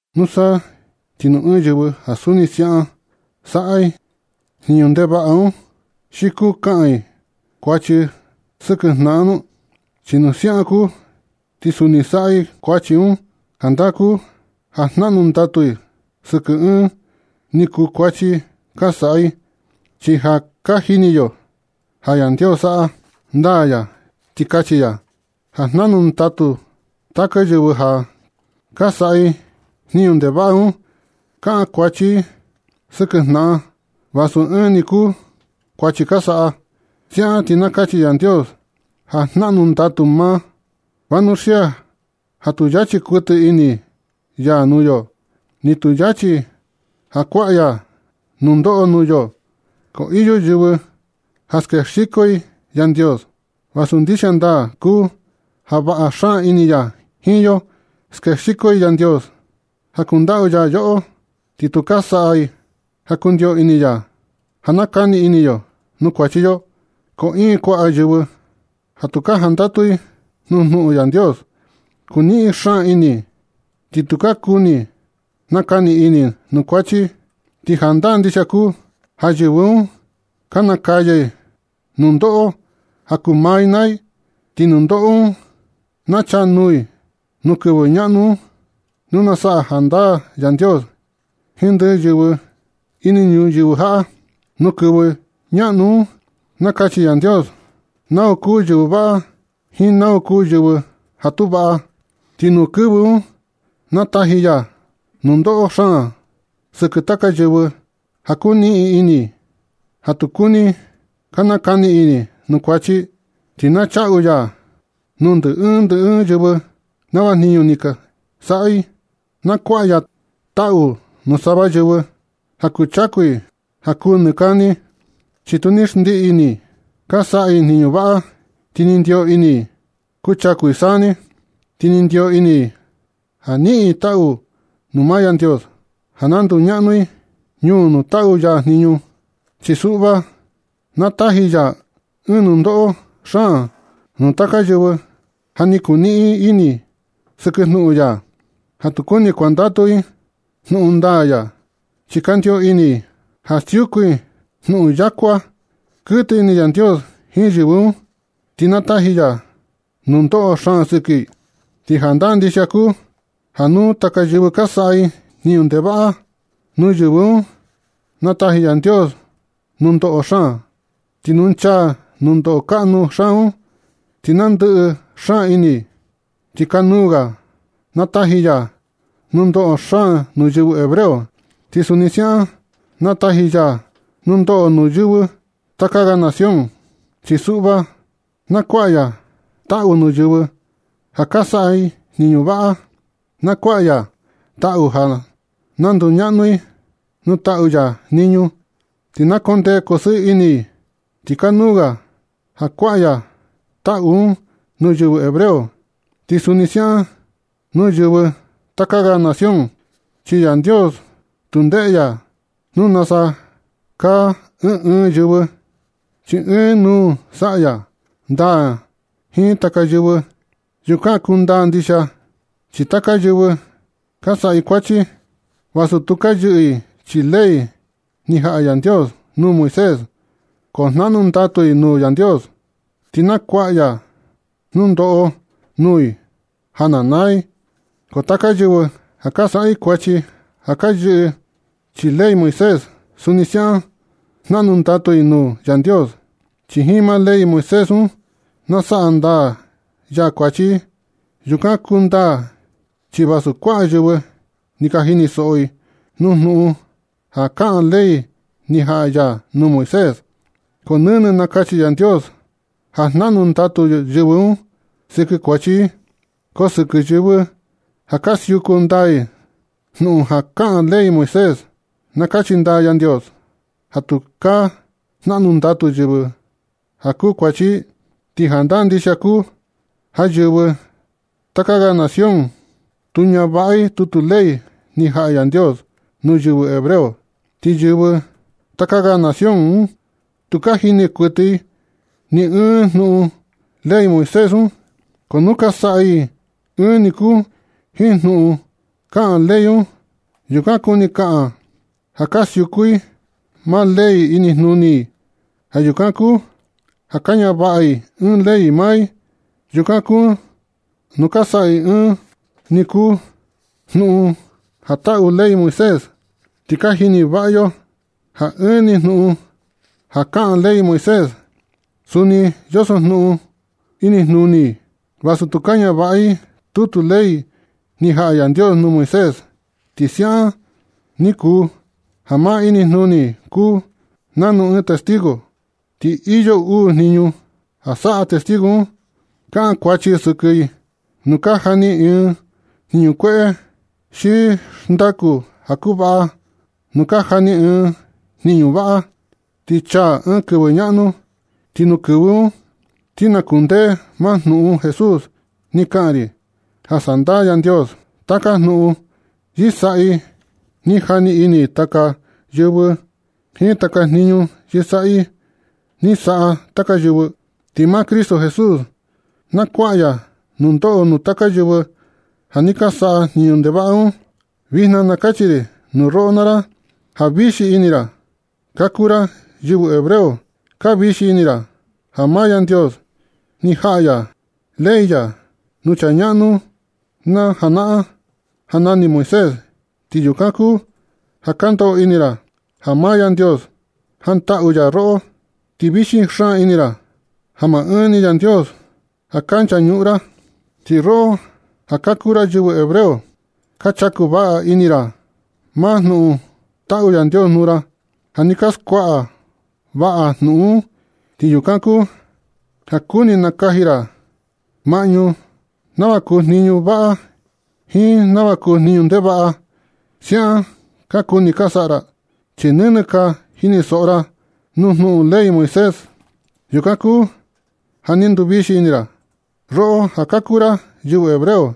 Nusa ti nu ɨɨn yɨvɨ ja suni siaꞌan saꞌa i jniñu ndevaꞌa un, ¿xi kuu kaꞌan i kuachi sɨkɨ jnaꞌan nu? Chi nu siaꞌan kuu ti suni saꞌa i kuachi un, jandaa kuu ja jnaꞌnu ndatu i sɨkɨ ɨɨn ni kuu kuachi ka saꞌa i. Chi ja ka jini yo ja Yandios, saꞌa ndaa ya ti kachi ya ja jnaꞌnu ndatu taka yɨvɨ ja ka saꞌa i jniñu ndevaꞌa un. Kaꞌan kuachi i sɨkɨ jnaꞌan vasu ɨɨn ni kuu kuachi ka saꞌa. Siaꞌan ti na kachi Yandios ja jnaꞌnu ndatu maa. Vanuxia ja tu yachi kuɨtɨ ini ya nuu yo, ni tu yachi ja kuaꞌa ya nundoꞌo nuu yo, ko iyo yɨvɨ ja skexiko i Yandios, vasu ndixia ndaa kuu ja vaꞌa xaan ini ya jiin yo. Skexiko i Yandios ja kundaꞌu ya yoꞌo, ti tu ka saꞌa i ja kundio ini ya ja nakani ini yo nuu kuachi yo. Ko iin kuaꞌa yɨvɨ ja tu ka jandatu i nuu jnuꞌun Yandios. Kuniꞌin xaan ini, ti tu ka kuni nakani ini nuu kuachi. Ti jandaa ndixia kuu ja yɨvɨ un ka nakaya i nundoꞌo ja kuu maa i naa i, ti nundoꞌo un na chaa nuu i nuu kɨvɨ ñaꞌnu un nu na saꞌa jandaa Yandios jiin ndɨ yɨvɨ ini ñuyɨvɨ jaꞌa. Nu kɨvɨ ñaꞌnu un na kachi Yandios nau kuu yɨvɨ vaꞌa jiin nau kuu yɨvɨ ja tu vaꞌa. Ti nuu kɨvɨ un na taji ya nundoꞌo xaan sɨkɨ taka yɨvɨ ja kuniꞌin ini i, ja tu kuni ka nakani ini i nuu kuachi i. Ti na chaꞌu ya nuu ndɨ ɨɨn ndɨ ɨɨn yɨvɨ nava jniñu ni saꞌa i. Na kuaꞌa ya taꞌu nuu sava yɨvɨ ja kuchaku i ja kuu nɨ kani, chi tu ni xndiꞌi ini i ka saꞌa i jniñu vaꞌa, ti ni ndio ini i kuchaku i saa ni, ti ni ndio ini i ja niꞌin i taꞌu nuu maa Yandios ja na nduñaꞌnu i ñuu nuu taꞌu ya jniñu. Chi suꞌva, na taji ya ɨɨn nundoꞌo xaan nuu taka yɨvɨ ja ni kuniꞌin ini i sɨkɨ jnuꞌun ya, ja tu kuni kuandatu i jnuꞌun ndaa ya, chi kandio ini i ja siuku i jnuꞌun yakuaa. Kɨtɨ ini Yandios jiin yɨvɨ un, ti na taji ya nundoꞌo xaan sɨkɨ i. Ti jandaa ndixia kuu ja nuu taka yɨvɨ ka saꞌa i jniñu ndevaꞌa, nuu yɨvɨ un na taji Yandios nundoꞌo xaan, ti nu nchaa nundoꞌo kaꞌnu xaan un, ti na ndɨꞌɨ xaan ini i. Ti kanuu ga na taji ya nundoꞌo xaan nuu yɨvɨ hebreo, ti suni siaꞌan na taji ya nundoꞌo nuu yɨvɨ taka ga nación. Chi suꞌva na kuaꞌa ya taꞌu nuu yɨvɨ ja ka saꞌa i jniñu vaꞌa. Na kuaꞌa ya taꞌu ja na nduñaꞌnu i nuu taꞌu ya jniñu, ti na kondee kosɨɨ ini i. Ti kanuu ga ja kuaꞌa ya taꞌu un nuu yɨvɨ hebreo, ti suni siaꞌan nuu yɨvɨ taka ga nación. Chi Yandios tu ndeꞌe ya nuu nasa kaa ɨɨn ɨɨn yɨvɨ, chi ɨɨn nuu saꞌa ya ndaa jiin taka yɨvɨ. Yukan kundaa ndixia chi taka yɨvɨ ka saꞌa i kuachi. Vasu tu ka yɨꞌɨ chii ley ni jaꞌa Yandios nuu Moisés, ko jnaꞌnu ndatu i nuu Yandios, ti na kuaꞌa ya nundoꞌo nuu i ja na naa i. Ko taka yɨvɨ ja ka saꞌa i kuachi ja ka yɨꞌɨ i chii ley Moisés, suni siaꞌan jnaꞌnu ndatu i nuu Yandios, chi jiin maa ley Moisés un na saꞌa ndaa ya kuachi i. Yukan kundaa chi vasu kuaꞌa yɨvɨ ni ka jini soꞌo i nuu jnuꞌun ja kaꞌan ley ni jaꞌa ya nuu Moisés, ko nɨnɨ na kachi Yandios ja jnaꞌnu ndatu yɨvɨ un sɨkɨ kuachi i. Ko sɨkɨ yɨvɨ ja ka siuku ndaa i jnuꞌun ja kaꞌan ley Moisés, na kachi ndaa Yandios ja tukaa jnaꞌnu ndatu yɨvɨ un ja kuu kuachi i. Ti jandaa ndixia kuu ja yɨvɨ taka ga nación tu ñavaꞌa i tutu ley ni jaꞌa Yandios nuu yɨvɨ hebreo. Ti yɨvɨ taka ga nación un tu ka jini kuɨtɨ i ni ɨɨn junuꞌun ley Moisés un. Ko nu ka saꞌa i ɨɨn ni kuu jiin jnuꞌun ja kaꞌan ley un, yukan kuni kaꞌan ja ka siuku i maa ley inijnuni i. Ja yukan kuu ja ka ñavaꞌa i ɨɨn ley maa i. Yukan kuu nu ka saꞌa i ɨɨn ni kuu jnuꞌun ja taꞌu ley Moisés, ti ka jini vaꞌa yo un ja ɨɨn ni jnuꞌun ja kaꞌan ley Moisés, suni yoso jnuꞌun un inijnuni i, vasu tu ka ñavaꞌa i tutu ley ni jaꞌa Yandios nuu Moisés. Ti siaꞌan ni kuu ja maa inijnuni i kuu nanu ɨɨn testigo, ti iyo uu jniñu ja saꞌa testigo un. Kaꞌan kuachi sɨkɨ i nu ka jani i ɨɨn jniñu kueꞌe xi xndaku ja kuvaꞌa nu ka jani i ɨɨn jniñu vaꞌa. Ti chaa ɨɨn kɨvɨ ñaꞌnu, ti nuu kɨvɨ un, ti na kundee maa jnuꞌun Jesús ni kaꞌan ri ja sandaa Yandios taka jnuꞌun yɨsaꞌi ni jani ini taka yɨvɨ jiin taka jniñu yɨsaꞌi ni saꞌa taka yɨvɨ. Ti maa Cristo Jesús na kuaꞌa ya nundoꞌo nuu taka yɨvɨ ja ni saꞌa jniñu ndevaꞌa un. Vijna na kachi ri nuu roꞌo naa ra ja vixi ini ra ka kuu ra yɨvɨ hebreo. Ka vixi ini ra ja maa Yandios ni jaꞌa ya ley ya nuu chaa ñaꞌnu na janaꞌan ja nani Moisés, ti yukan kuu ja ka ndoꞌo ini ra ja maa Yandios jantaꞌu ya roꞌo. Ti vixi xaan ini ra ja maa ɨɨn ni Yandios ja ka nchañuꞌun ra. Ti roꞌo ja ka kuu ra yɨvɨ hebreo, ka chaku vaꞌa ini ra maa jnuꞌun taꞌu Yandios nuu ra. Ja ni ka skuaꞌa vaꞌa jnuꞌun un, ti yukan kuu ja kuni nakaji ra maꞌñu nava kuu jniñu vaꞌa jiin nava kuu jniñu ndevaꞌa. Siaꞌan ka kuni ka saꞌa ra, chi nɨnɨ ka jinisoꞌo ra nuu jnuꞌun ley Moisés. Yukan kuu ja ni nduvixi ini ra, roꞌo ja ka kuu ra yɨvɨ hebreo,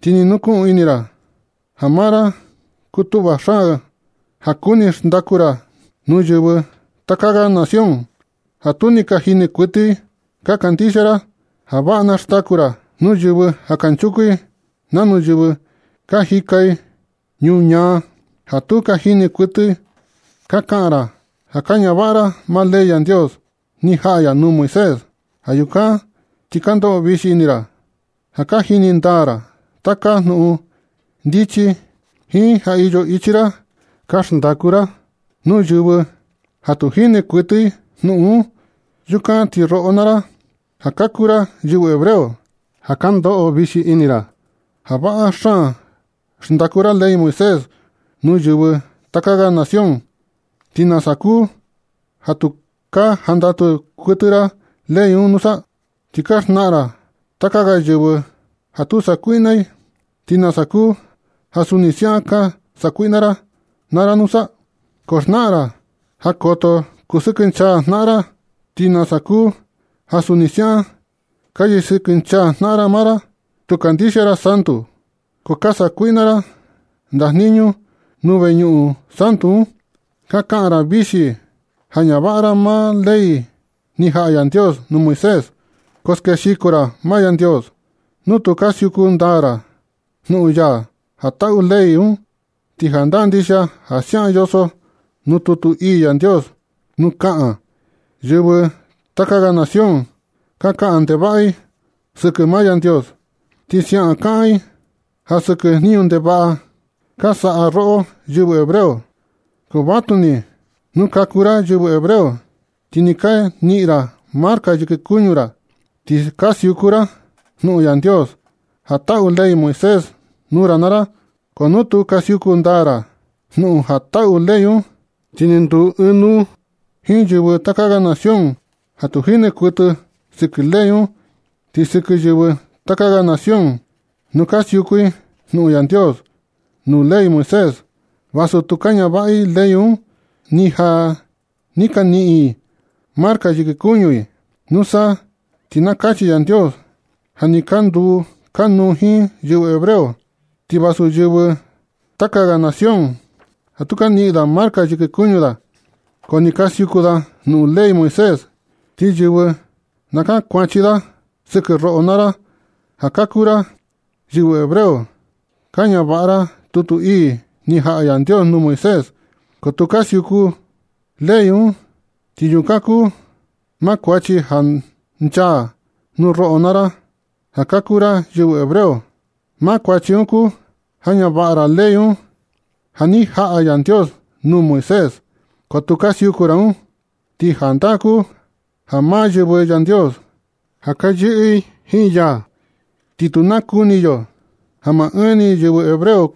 ti ni nukuꞌun ini ra ja maa ra kutuꞌva xaan ja kuni xndaku ra nuu yɨvɨ taka ga nación ja tu ka jini kuɨtɨ i. Ka kandixia ra ja vaꞌa na xndaku ra nuu yɨvɨ ja kanchuku i nanu yɨvɨ ka jika i ñuñaa, ja tu ka jini kuɨtɨ i. Ka kaꞌan ra ja ka ñavaꞌa ra maa ley Yandios ni jaꞌa ya nuu Moisés. Ja yukan ti ka ndoꞌo vixi ini ra ja ka jini ndaa ra taka jnuꞌun ndichi, jiin ja iyo ichi ra ka xndaku ra nuu yɨvɨ ja tu jini kuɨtɨ i jnuꞌun un. Yukan ti roꞌo naa ra, ja ka kuu ra yɨvɨ hebreo, ja ka ndoꞌo vixi ini ra ja vaꞌa xaan xndaku ra ley Moisés nuu yɨvɨ taka ga nación, ¿ti nasa kuu ja tu ka jandatu kuɨtɨ ra ley un nusa? Ti ka xnaꞌan ra taka ga yɨvɨ ja tu sakuiꞌna i, ¿ti nasa kuu ja suni siaꞌan ka sakuiꞌna ra naa ra nusa? Ka xnaꞌan ra ja koto kusɨkɨnchaa jnaꞌan i, ¿ti nasa kuu ja suni siaꞌan ka yɨsɨkɨnchaa jnaꞌan ra maa ra? Tu kandixia ra santu, ko ka sa kuiꞌna ra ndajniñu nuu veñuꞌun santu un. Ka kaꞌan ra vixi ja ñavaꞌa ra maa ley ni jaꞌa Yandios nuu Moisés, ko skexiko ra maa Yandios nu tu ka siuku ndaa ra jnuꞌun ya ja taꞌu ley un. Ti jandaa ndixia ja siaꞌan yoso nuu tutu ii Yandios nu kaꞌan: “Yɨvɨ taka ga nación ka kaꞌan ndevaꞌa i sɨkɨ maa Yandios, ti siaꞌan kaꞌan i ja sɨkɨ jniñu ndevaꞌa ka saꞌa roꞌo yɨvɨ hebreo.” Ko vatuni nu ka kuu ra yɨvɨ hebreo, ti ni ka niꞌin ra marca yɨkɨ kuñu ra, ti ka siuku ra jnuꞌun Yandios ja taꞌu ley Moisés nuu ra naa ra. Ko nu tu ka siuku ndaa ra jnuꞌun ja taꞌu ley un, ti ni nduu ɨɨn nuu jiin yɨvɨ taka ga nación ja tu jini kuɨtɨ sɨkɨ ley un. Ti sɨkɨ yɨvɨ taka ga nación, nu ka siuku i jnuꞌun Yandios nuu ley Moisés, vasu tu ka ñavaꞌa i ley un, ni ja ni ka niꞌin i marca yɨkɨ kuñu i, nusa ti na kachi Yandios ja ni ka nduu kanuu jiin yɨvɨ hebreo. Ti vasu yɨvɨ taka ga nación ja tu ka niꞌin da marca yɨkɨ kuñu da, ko ka siuku da jnuꞌun ley Moisés, ti yɨvɨ na kankuachi da sɨkɨ roꞌo naa ra ja ka kuu ra yɨvɨ hebreo. Ka ñavaꞌa ra tutu ii ni jaꞌa Yandios nuu Moisés, ko tu ka siuku i ley un. Ti yukan kuu maa kuachi ja nchaa nuu roꞌo naa ra ja ka kuu ra yɨvɨ hebreo. Maa kuachi un kuu ja ñavaꞌa ra ley un ja ni jaꞌa Yandios nuu Moisés, ko tu ka siuku ra un. Ti jandaa kuu ja maa yɨvɨ Yandios ja ka yɨꞌɨ i jiin ya, ti tu nakuni yo ja maa ɨɨn ni yɨvɨ hebreo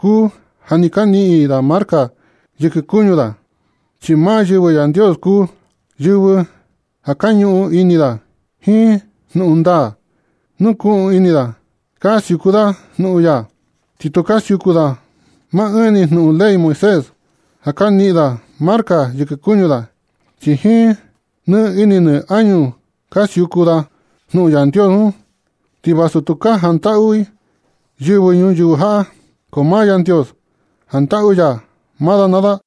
kuu ja ni ka niꞌin da marca yɨkɨ kuñu da, chi maa yɨvɨ Yandios kuu yɨvɨ ja ka ñuꞌun ini da jiin jnuꞌun ndaa. Nukuꞌun ini da ka siuku da jnuꞌun ya. Ti tu ka siuku da maa ɨɨn ni jnuꞌun ley Moisés, ja na niꞌin da marca yɨkɨ kuñu da, chi jiin nɨ ini nɨ añu ka siuku da jnuꞌun Yandios un. Ti vasu tu ka jantaꞌu i yɨvɨ ñuyɨvɨ jaꞌa, ko maa Yandios jantaꞌu ya maa da naa da.